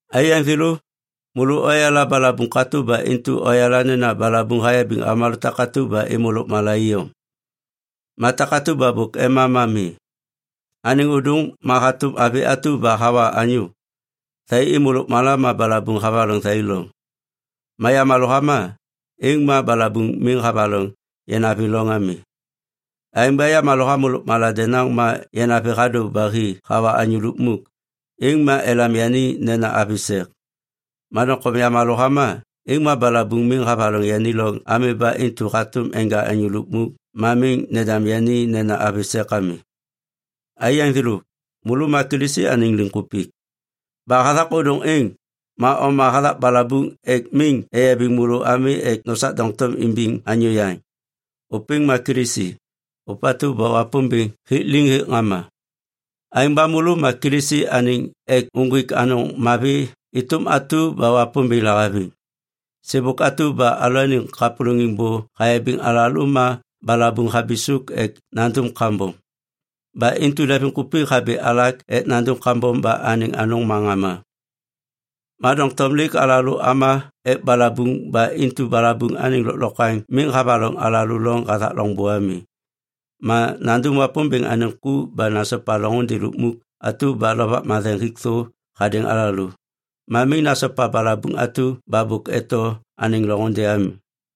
Aiyaŋ thêlô, môlô oyala balabuŋ katô ba intu oyala nena balabuŋ hayabiŋ avômalô takatu ba êmô lôkmala iyom. Ma takatu ba bôk ema ma mi. Anêŋ ôdôŋ ma hatôm avi atu ba hawa anyô. Thai êmô lôkmala ma balabuŋ havaloŋ thai loŋ. Ma yamalô hama, êŋ ma balabuŋ miŋ havaloŋ yanavi loŋ ami. Aêŋ ba yamalô hamô lôkmala denaŋ ma yanavi hadô ba hi hawa anyô lukmuk, êŋ ma elam yani nena avi sek. Ma doŋtom yamalô hama, êŋ ma balabuŋ miŋ havaloŋ yani loŋ ami ba intu hatôm enja anyô lukmuk ma miŋ nendam yani nena avi sek ami. Aiyaŋ thêlô, môlô ma Kilisi anêŋ liŋkupik. Ba hathak ôdôŋ êŋ, ma oma hathak balabuŋ ek miŋ eyabiŋ môlô ami ek nosak doŋtom imbiŋ anyô yaŋ. Ôpêŋ ma Kilisi, ôpatu ba Wapômbêŋ hik liŋ hêk ŋama. Aêŋ ba môlô ma Kilisi anêŋ ek uŋgwik anôŋ mavi êtôm atu ba Wapômbêŋ lahaviŋ. Sêbôk atu ba alalôaniŋ kapôlôŋiŋ bô hayabiŋ alalô ma balabuŋ habisôk ek nandum kambom. Ba intu leŋviŋkupik habi alak ek nandum kambom ba anêŋ anôŋ ma ŋama. Ma doŋtom lêk alalô ama ek balabuŋ ba intu balabuŋ anêŋ lôklokwaŋ miŋ havaloŋ alalô loŋ hathak loŋbô ami. Ma nandum Wapômbêŋ anêŋ ku ba nasopa loŋôndê lukmuk atu ba Lovak Matheŋ hik thô hadêŋ alalô. Ma miŋ nasopa balabuŋ atu ba bôk eto anêŋ loŋôndê ami.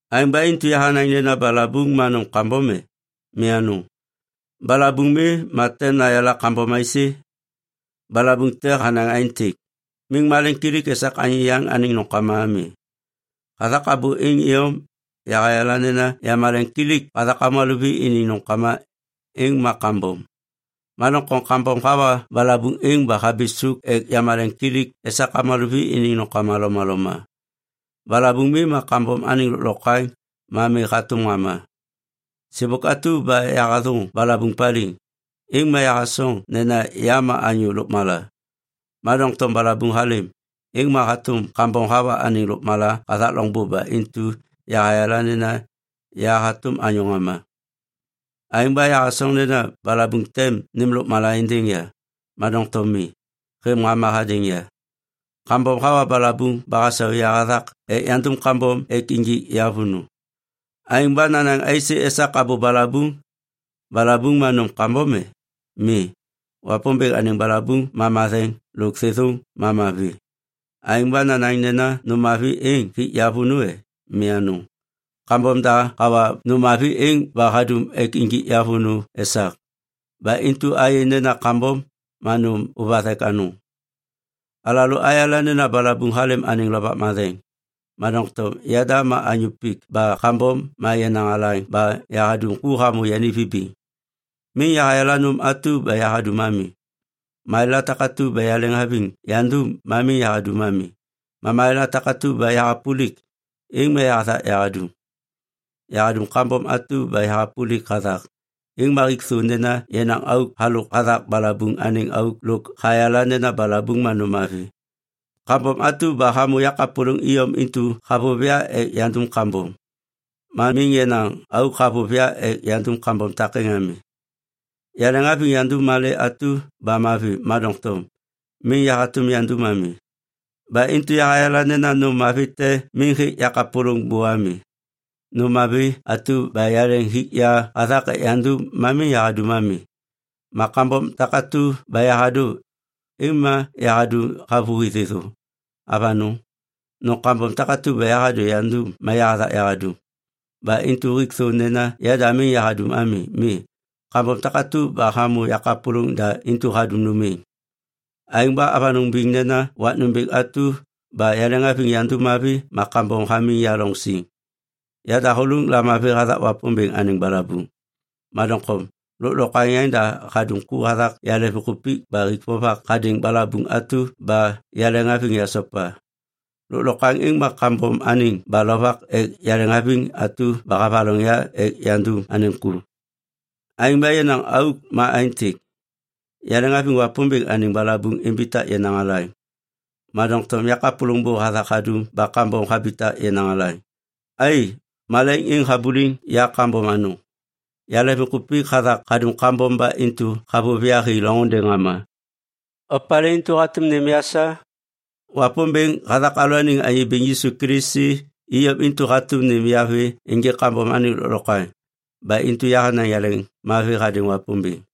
Aêŋ ba intu yahanaŋ nena balabuŋ ma nôm kambom e? Mi anôŋ. Balabuŋ mi, ma tem yayala kambom aisê? Balabuŋ te hanaŋ aêntêk, “Miŋ malemkilik esak anyô yaŋ anêŋ nômkama ami.” Hathak abô êŋ iyom, yahayala nena yamaleŋkilik hathak avômalô vi iniŋ nômkama, êŋ ma kambom. Ma doŋtom kambom hawa balabuŋ êŋ ba habisôk ek yamaleŋkilik esak avômalô vi iniŋ nômkama lomaloma. Balabuŋ mi, ma kambom anêŋ lôklokwaŋ ma mi hatôm ŋama. Sêbôk atu ba yahathôŋ balabuŋ paliŋ, êŋ ma yahasoŋ nena ya ma anyô lôkmala. Ma doŋtom balabuŋ halêm, êŋ ma hatôm kambom hawa anêŋ lôkmala hathak loŋbô ba intu yahayala nena ya hatôm anyô ŋama. Aêŋ ba yahasoŋ nena balabuŋ tem nêm lôkmala êndêŋ ya. Ma doŋtom mi, hêv ŋama hadêŋ ya. Kambom hawa balabuŋ ba hasau ya hathak ek yandum kambom ek injik ya vônô. Aêŋ ba nanaŋ aisê esak abô balabuŋ? Balabuŋ ma nôm kambom e? Mi, Wapômbêŋ anêŋ balabuŋ ma matheŋ lôk thêthôŋ ma mavi. Aêŋ ba nanaŋ nena nôm mavi êŋ hik ya vônô e? Mi anôŋ! Kambom da hawa nôm mavi êŋ ba hadum ek injik ya vônô esak. Ba intu ayê nena kambom ma nôm ôvathek anôŋ. Alalô nayala nena balabuŋ halêm anêŋ Lovak Matheŋ, ma doŋtom yada ma anyô pik ba kambom ma yenaŋ alaŋ ba yahadum ku hamô yani vibiŋ. Miŋ yahayala nôm atu ba yahadum ami. Malêla takatu ba yaleŋhaviŋ yandum ma miŋ yahadum ami. Ma malêla takatu ba yahapôlik, êŋ ma yahathak yahadum. Yahadum kambom atu ba yahapôlik hathak, êŋ ma hik thô nena yenaŋ auk halôk hathak balabuŋ anêŋ auk lôk hayala nena balabuŋ ma nôm mavi. Kambom atu ba hamô yakapôlôŋ iyom intu havôv ya ek yandum kambom. Ma miŋ yenaŋ auk havôv ya ek yandum kambom takêŋ ami. Yaleŋhaviŋ yandum malê atu ba mavi, ma doŋtom miŋ yahatôm yandum ami. Ba intu yahayala nena nômla mavi te miŋ hêk yakapôlôŋ bô ami. Nôm mavi atu ba yaleŋ hik ya hathak ek yandum ma miŋ yahadum ami. Ma kambom takatu ba yahadô, êŋ ma yahadum havôhi thêthô. Avanôŋ, nôm kambom takatu ba yahadô yandum ma yahathak yahadum, ba intu hik thô nena yada miŋ yahadum ami. Mi, kambom takatu ba hamô yakapôlôŋ da intu hadum nôm êŋ. Aêŋ ba avanôŋ biŋ nena wak nômbêŋ atu ba yaleŋhaviŋ yandum mavi ma kambom hamiŋ ya loŋ siŋ. Ya dahôlôŋ lamavi hathak Wapômbêŋ anêŋ balabuŋ, ma doŋtom lôklokwaŋ yaŋda hadum ku hathak yaleŋviŋkupik ba hik vovak hadêŋ balabuŋ atu ba yaleŋhaviŋ yasopa. Lôklokwaŋ êŋ ma kambom anêŋ ba lovak ek yaleŋhaviŋ atu ba havaloŋ ya ek yandum anêŋ ku. Aêŋ ba yenaŋ auk ma aêntêk. Yaleŋhaviŋ Wapômbêŋ anêŋ balabuŋ imbitak yenaŋ alaŋ, ma doŋtom yakapôlôŋ bô hathak hadum ba kambom habitak yenaŋ alaŋ. Ai, malaiŋ êŋ habuliŋ ya kambom anôŋ! Yaleŋviŋkupik hathak hadum kambom ba intu havôv ya hi loŋôndê ŋama. Opalê intu hatôm nêm ya sa? Wapômbêŋ hathak alalôaniŋ Anyô Bêŋ Yisu Kilisi iyom intu hatôm nêm ya vê ênjêk kambom anêŋ lôklokwaŋ, ba intu yahanaŋ yaleŋmavi hadêŋ Wapômbêŋ.